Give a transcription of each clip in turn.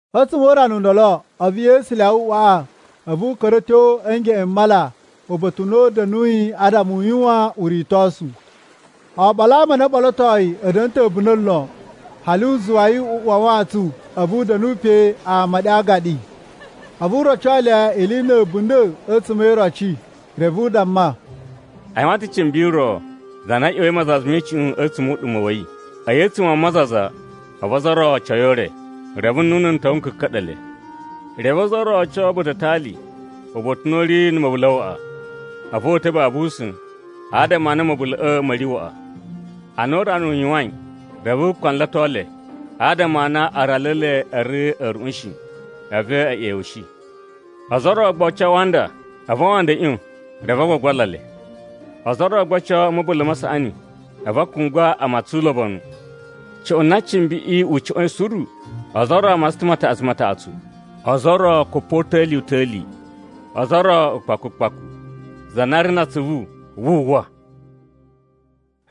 A̱tsuma̱ o urana u ndolo, a̱vu Yesu lyawa uꞌwaꞌa, a̱vu u ka̱ra̱ a̱ tyo a̱ ngeꞌen m mala, uba̱ta̱ u na u da̱nuyi adama u yuwan uritosu. Oɓolo a ama a na o ɓolotoi a̱ da̱na̱ ta̱ a̱bunda̱ lon, hali u zuwa yi u uwa a wantsun, a̱vu u da̱nu pe, ama ɗe a aagaɗi. A̱vu u roco le ili na̱ a̱bunda̱ a̱tsuma̱ e iroci. Reve u damma, “A yuwan ta̱ cimbi ro za na ꞌya̱wa̱i mazaza me icuꞌun a̱tsuma̱ o uɗuma̱ wa̱ yi. A̱yi a̱tsuma̱ a mazaza, a̱vu ozo o ro o oco yi o ure, reve nnunu n ta̱wa̱ n ka̱ka̱ɗa̱ le. Reve ozo o ro o oco ba̱ta̱ a atali, uba̱ta̱ u na u ri na̱ ma̱bula̱ waꞌa. A̱vu o uta̱ babu usa̱n, adama a na ma̱bula̱ꞌa̱ ma̱ ri waꞌa. Ana urana u yuwain, reve u kpanlato le, adama a na aralu e le a̱ ri a̱ruꞌun shi, a̱vu e ꞌyewushi. Ozo o ro gba o oco a awanda, a̱vu awanda a̱ ꞌyon, reve a gbagbala le. Ozo o ro gba o oco a̱ ma̱bula̱ ma saꞌani, a̱vu a kungwa a matsan ulobonu. Cuꞌun na cimbiꞌi u cuꞌwa̱in suru, ozo o ro a matsan ta̱ mataꞌatsu mataꞌatsu, ozo o ro kupota̱li-uta̱li, ozo o ro ukpaku ukpaku. Za na ri na atsuvu, wu uwwa!”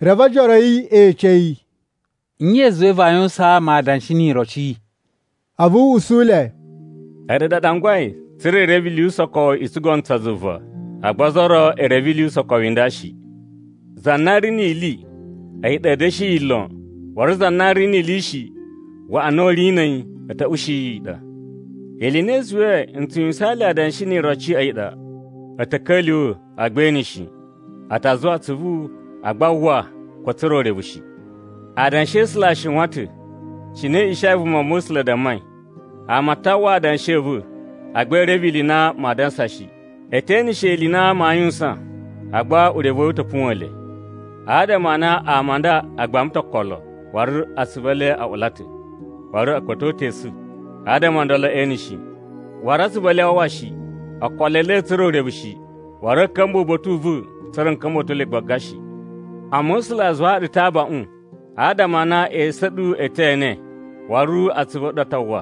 Reve ojoro a̱ yi e ece yi, “Nye i zuwai vaa yuwusaan ama adanshi ni iroci?” A̱vu u usu le, “A̱ɗu ɗa a ɗangwai tsa̱ra̱ i reve ili yu usokowu i tsugono tsa zuva, agba ozo o ro e reve ili yu usokowu i nda shi. Za na ri ni ili, a̱yi ɗa a̱a̱ da̱shi yi lon, waru za na ri ni ili shi, waꞌa na u ri na̱ a̱yi, a̱ ta̱ ushi yi i ɗa. Ili i na i zuwai n tsu yuwusaan le adanshi ni iroci a̱yi ɗa: ‘A̱ ta̱ ka̱lyuwa̱, agba ee ene shi, a ta zuwa atsuvu, agba aa uwwa ko a̱ tsura̱ urevu shi.’ “Adanshi a̱ A̱sula̱ a shiwan ta̱, cine Ishaya vumava̱sula̱ dammai: ‘Ama a ta uwwa adanshi a̱ va̱, agba ee reve ili i na maa dansa shi. E te eneshe ili i na maa yuwusan, agba urevu wa̱ yi u ta̱ puwa̱n le. Adama a na ama a nda a gbama ta̱ okolo, waru atsuvu e le a ula ta̱, waru a̱ kpa̱to ta̱ esu, adama o ndolo ee ene shi, waru atsuvu e le aa uwwa shi, okolo e le a̱a̱ tsura̱ urevu shi, waru a̱a̱ ka̱mba̱ uba̱ta̱ u va̱, tsa̱ra̱ n ka̱mba̱to le gbaga shi.’ “Amma A̱sula̱ a zuwaa ɗu ta̱ abaꞌun, adama a na esu a̱ ɗu e te ene waru atsuvu a̱ ɗu a ta uwwa!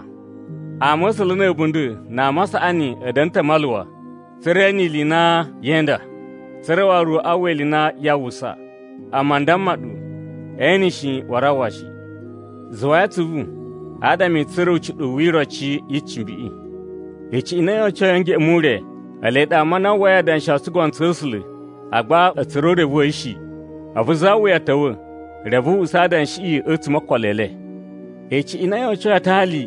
Ama̱sula̱ na̱ a̱bunda̱ na ama a saꞌani a̱ da̱na̱ ta̱ a maluwa tsa̱ra̱ e ene ili i na yee inda, tsa̱ra̱ waru a uwwa ili i na yaa uwwusa. Amma n damma ɗu e ene shi, waru a uwwa shi. “Zuwai atsuvu, adama i tsura̱ ucuɗuwu wi iroci yi cimbiꞌi. Icuꞌun i na yo ocoi a̱ ngeꞌen mu ure, ele ɗa ama a na a uwwai adanshi o tsugono tsa̱ A̱sula̱, agba a̱ tsura̱ urevu wa̱ yi shi. A̱vu za wuya ta̱wa̱, reve u usa adanshiꞌi a̱tsuma̱ o okolo e le. Icuꞌun i na yo ocoi ba̱ta̱ a atali,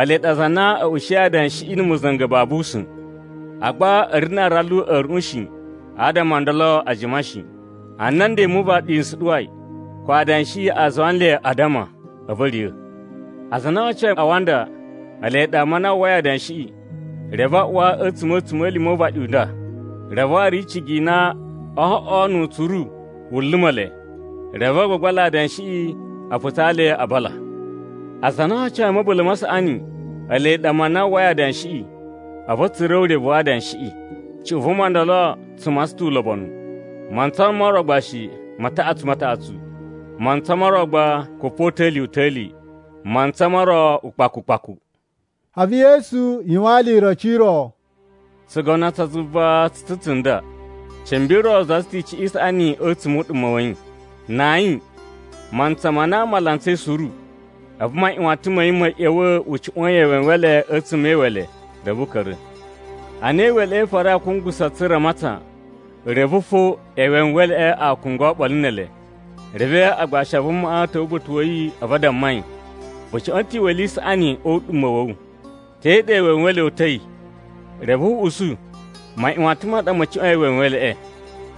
ele ɗa aza a na a̱ ushiyi adanshiꞌi na̱ ma̱za̱nga̱ babu usa̱n. Agba a̱ ri na aralu a̱ a̱ruꞌun shi, adama o ndolo a jima shi. Ana nden mu uvaɗi n suɗuwai, ko adanshiꞌi a zuwa nle a addama, a̱vu a̱ riya̱. Aza a na o ocoi a awanda, ele ɗa ama a na a uwwai adanshiꞌi, reve a uwa a̱tsuma̱ a̱tsuma̱lima̱ o uvaɗi u nda, reve waru icigi i na oo oꞌwo nu utsuru wu luma̱ le. Reve a gbagbala adanshiꞌi a putsaa le a bala. Aza a na o ocoi a̱ ma̱bula̱ ma saꞌani, ele ɗa ama a na a uwwai adanshiꞌi, a̱vu a̱ tsura̱ urevu wa adanshiꞌi. Cuꞌun vuma ndolo tsu matsan ta̱ ulobonu, mantsa mo ro gba shi, mataꞌatsu mataꞌatsu, mantsa mo ro gba kupota̱li-uta̱li, mantsa mo ro ukpaku ukpaku.” A̱vu Yesu yuwaan le iroci i ro: “Tsugono tsa zuva tsu ta̱ ne tsunda: Cimbi ro zaza ta̱ icuꞌun i saꞌani a̱tsuma̱ o uɗuma̱ wa̱ yi. Na ayin, mantsa ma na ama a lantsai suru, a̱vu maꞌyuwatan ma̱ yi ma̱ ꞌya̱wa̱ u cuꞌwa̱a̱n yi ewenwele a̱tsuma̱ e iwele reve u ka̱ra̱. Ana iweleꞌe i farai a kungusa tsa̱ra̱ a matsan, reve fo ewenweleꞌe a kungwa oɓolo ne ele. Reve agbashi a vumaꞌa a̱ ta̱wa̱ uba̱ta̱ wa̱ yi a̱vu a damma yi, ‘Vu cuꞌwa̱n ta̱ icuꞌun i saꞌani o uɗuma̱ wa̱ wu. Te ɗa ewenwele o uta̱i?’ “Reve u usu, ‘Maꞌyuwatan ma ɗa ma̱ cuꞌwa̱in ewenweleꞌe.’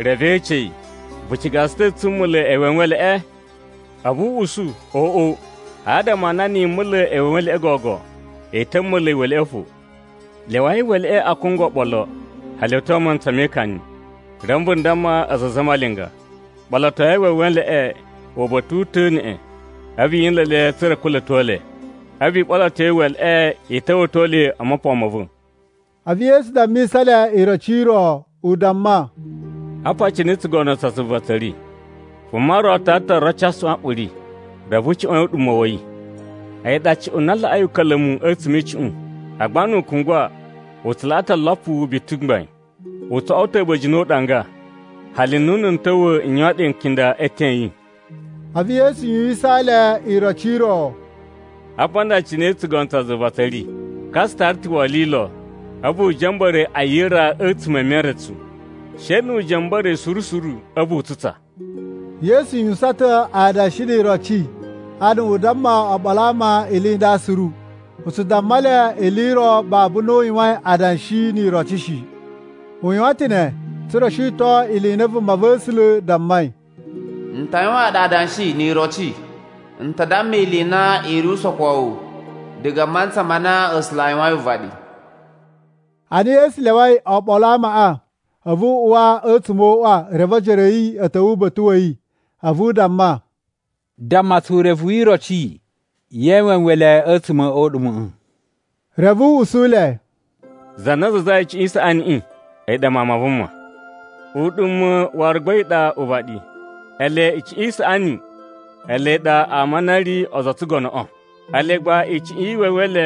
“Reve e ece yi, ‘Vu ciga tsu ta̱ tsu mula̱ ewenweleꞌe?’ “A̱vu u usu, ‘Oꞌo, adama a na na̱ yi mula̱ ewenweleꞌe gogo, i ta̱ mula̱ iwele fo. Lyawai iweleꞌe a kungwa oɓolo, hali a̱ tyo a mantsa me ikani. Reve n damma aza a zamalinga: Ɓolotoi ewenweleꞌe uba̱ta̱ u ta̱ neꞌen, a̱vu yi nla̱ le tsa̱ra̱ i kula̱to le. A̱vu i ɓoloto iweleꞌe i ta̱wa̱to le o mopon ma̱ va̱.’” A̱vu Yesu dammisa le iroci i ro, u damma, “Apa cine tsugono tsa zuva tsa̱ ri: Vuma ro tara ta̱ oroci a suꞌwanꞌuri, reve u cuꞌwa̱n yi a̱tsuma̱ o uɗuma̱ wa̱ yi. A̱yi ɗa cuꞌun na laꞌai uka̱la̱mu a̱tsuma̱ e icuꞌun, agba nu u kungwa, u tsu laꞌa ta̱ olopu biti mgbain. U tso oꞌwo ta̱ a̱ba̱jini o uɗanga, hali nnunu n ta̱wa̱ n yuwan ɗe nkinda e eten a̱ yi.” A̱vu Yesu yuwusaan le iroci i ro, “Apa a nda cine tsugono tsa zuva tsa̱ ri: Ka tsu tara ta̱ wolilo a̱vu u ja̱mba̱ra̱ yi a yira a̱tsuma̱ e meretsu, she nu u ja̱mba̱ra̱ yi suru suru, a̱vu u tsutsa.” Yesu yuwusan ta̱ adanshi ni iroci adama u damma oɓolo a ama ili i nda suru. U tsu damma le ili i ro babu na u yuwain adanshi ni iroci shi. U yuwan ta̱ ne tsa̱ra̱ u shiton ili i na vumava̱sula̱ dammai, “N ta yuwaan ɗu adanshi ni iroci. N ta damma ili i na i ri usokowu diga a mantsa ma na A̱sula̱ a yuwain uvaɗi.” Ana Yesu lyawai oɓolo a amaꞌa, a̱vu u uwa a̱tsuma̱ o uꞌwa, reve ojoro a̱ yi a̱ ta̱wa̱ uba̱ta̱ wa̱ yi a̱vu a damma, “Damma tsu urevu wi iroci ye ewenwele a̱tsuma̱ o uɗuma̱ꞌa̱.” Reve u usu le, “Za na zazai icuꞌun i saꞌaniꞌi a̱yi ɗa Mawun ma Vuma. Uɗuma̱ waru gba a̱yi ɗa uvaɗi. Ele icuꞌun i saꞌani ele ɗa ama a na a̱ ri ozo o tsugonoꞌo. Ele gba icuꞌun ye ewenwele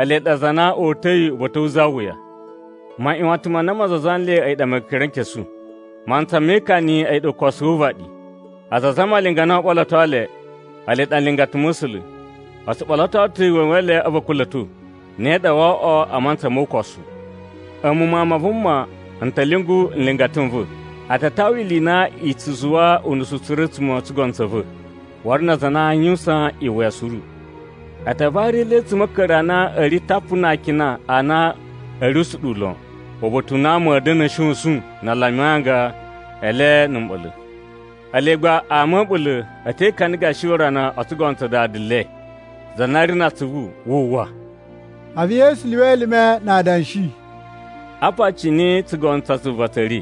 ele ɗa aza a na o uta̱i uba̱ta̱ wu za wuya. Maꞌyuwatan ma na ma zaza nle a̱yi ɗa Mekerenkesu. Mantsa me ikani a̱yi ukosu wu uvaɗi. Aza a zamalinga a na oo ɓoloto le, ele ɗa nlingata ma̱ A̱sula̱. “O tsu ɓoloto ta̱ ewenwele a̱vu a̱ kula̱to. Ne ɗa woo oꞌwo a mantsa mo ukosu. A̱mu Mawun ma Vuma, n ta̱ lyungu nlingata n va̱, a ta tawa ili i na i tsu zuwa unusu suru a̱tsuma̱ o tsugono tsa̱ va, waru na aza a na aa yuwusan iwuya suru. A ta vari le a̱tsuma̱ a̱ a̱a̱ka̱ri a na a̱ ri tapu na akina a na a̱ ri usuɗuwu lon, uba̱ta̱ u na ama a̱ da̱na̱ a̱ shosun na a lumi anga e le na̱ mɓa̱la̱. Ele gba ama a̱ a̱ɓula̱ a̱ te ikana gashi urana o tsugono tsa Dada le. Za na ri na atsuvu, wu uwwa!” A̱vu Yesu lyuwa elime na adanshi, “Apa cine tsugono tsa zuva tsa̱ ri: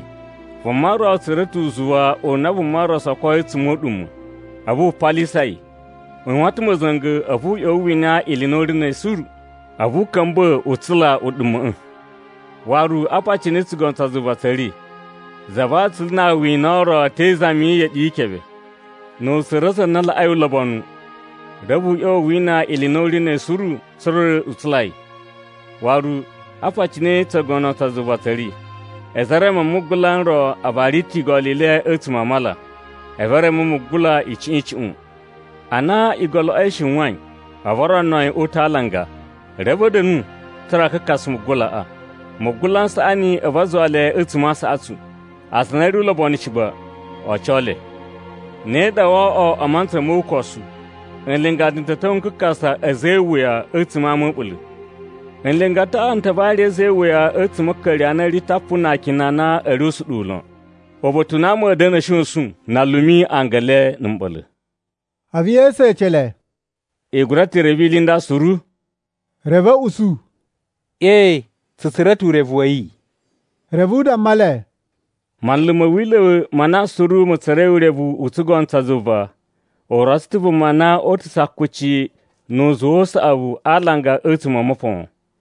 Vuma ro tsura̱ ta̱ uzuwa u na vuma ro sokoi a̱tsuma̱ o uɗuma̱. A̱vu wu palisa yi. U yuwan ta̱ ma̱za̱nga̱ a̱vu u ꞌya̱wa̱ u wina ili i na u ri na̱ a̱yi suru, a̱vu u ka̱mba̱ u tsula uɗuma̱ꞌa̱. “Waru, apa cine tsugono tsa zuva tsa̱ ri: Za va atsulu na awina ro te izami yi iyeɗi yi ikebe. Nu u tsura̱ za na laꞌai ulobonu, reve u ꞌya̱wa̱ u wina ili i na u ri na̱ a̱yi suru tsa̱ra̱ u tsula yi. “Waru, apa cine tsugono tsa zuva tsa̱ ri: A̱za̱ e mereme ma mugula n ro a vari ta̱ igolo i le a̱tsuma̱ a mala, a̱vu e reme mugula icuꞌun icuꞌun. Ana igoloꞌo i shiwain, a̱vu o rono yi o uta̱ a alanga, reve a̱ da̱nu tsa̱ra̱ a kakasa mugulaꞌa. Mugula n saꞌani a̱vu a zuwa le a̱tsuma̱ a aasaꞌatsu, aza a na a̱ ri ulobonu shi gba, o oco le. Ne ɗa woo oꞌwo mantsa mo ukosu. Nlingata n ta̱ ta̱wa̱ a kakasa a̱za̱ e iwuya a̱tsuma̱ a ama a̱ a̱ɓula̱. Nlingataꞌa n ta vari a̱za̱ e iwuya a̱tsuma̱ a̱ a̱a̱ka̱ri a na a̱ ri tapu na akina a na a̱ ri usuɗuwu lon, uba̱ta̱ u na ama a̱a̱ da̱na̱ a̱ shosun na a lumi anga na̱ mɓa̱la̱.” A̱vu Yesu ece le, “I gura ta̱ reve ili i nda suru?” Reve a̱ usu, “Ee, tsu tsura̱ ta̱ urevu wa̱ yi.” Reve u damma le, “Manlu ma̱ wila̱ ma na suru ma̱ tsura̱i urevu u tsugono tsa zuva u rotso ta̱ vuma na oo uta̱su akuci nu uzuwa u saꞌavu a alanga a̱tsuma̱ o mopon.”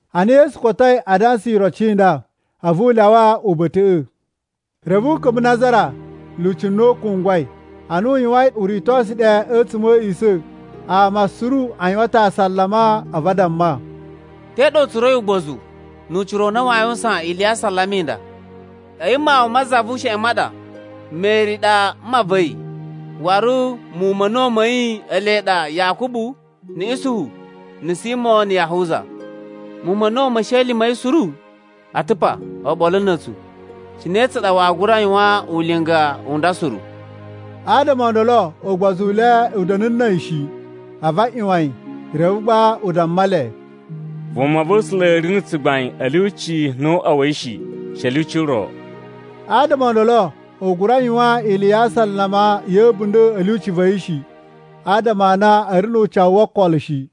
Ana Yesu kotoi adansa iroci i nda, a̱vu u lyawa uba̱ta̱ꞌa̱. Reve u ka̱mba̱ Nazara, lyuci na u kungwai. Ana u yuwain uritosu ɗe a̱tsuma̱ a̱ a̱a̱ꞌisa̱, ama suru a yuwan ta̱ asalama a̱vu a damma, “Te ɗa u tsura̱i ugbozu nu ucira u na waa yuwusan ili ya asalama i nda? A̱yi mawun ma za vu usheꞌen ma ɗa. Meri ɗa mma va̱ yi, waru muwun ma̱ a̱na̱wu ma̱ yi ele ɗa, Yakubu, na̱ Isuhu, na̱ Simo na̱ Yahuza. Muwun ma̱ a̱na̱wu me esheli ma̱ yi suru a̱ ta̱ pa oɓolo na̱ a̱tsu. Cine tsa ɗa waa gura yuwan ulinga u nda suru?” Adama o ndolo ugbozu u le u da̱nu na̱ a̱yi shi, a̱vu a ꞌyuwan yi. Reve gba u damma le, “Vumava̱sula̱ ri na̱ tsugbain a̱ lyuci no o uꞌwa wa̱ yi shi, she a̱ lyuci ro.” Adama o ndolo, u gura yuwan ili ya asalama ya̱ a̱bunda̱ a̱ lyuci va̱ yi shi, adama a na a̱ ri nu ucawu wo okolo shi.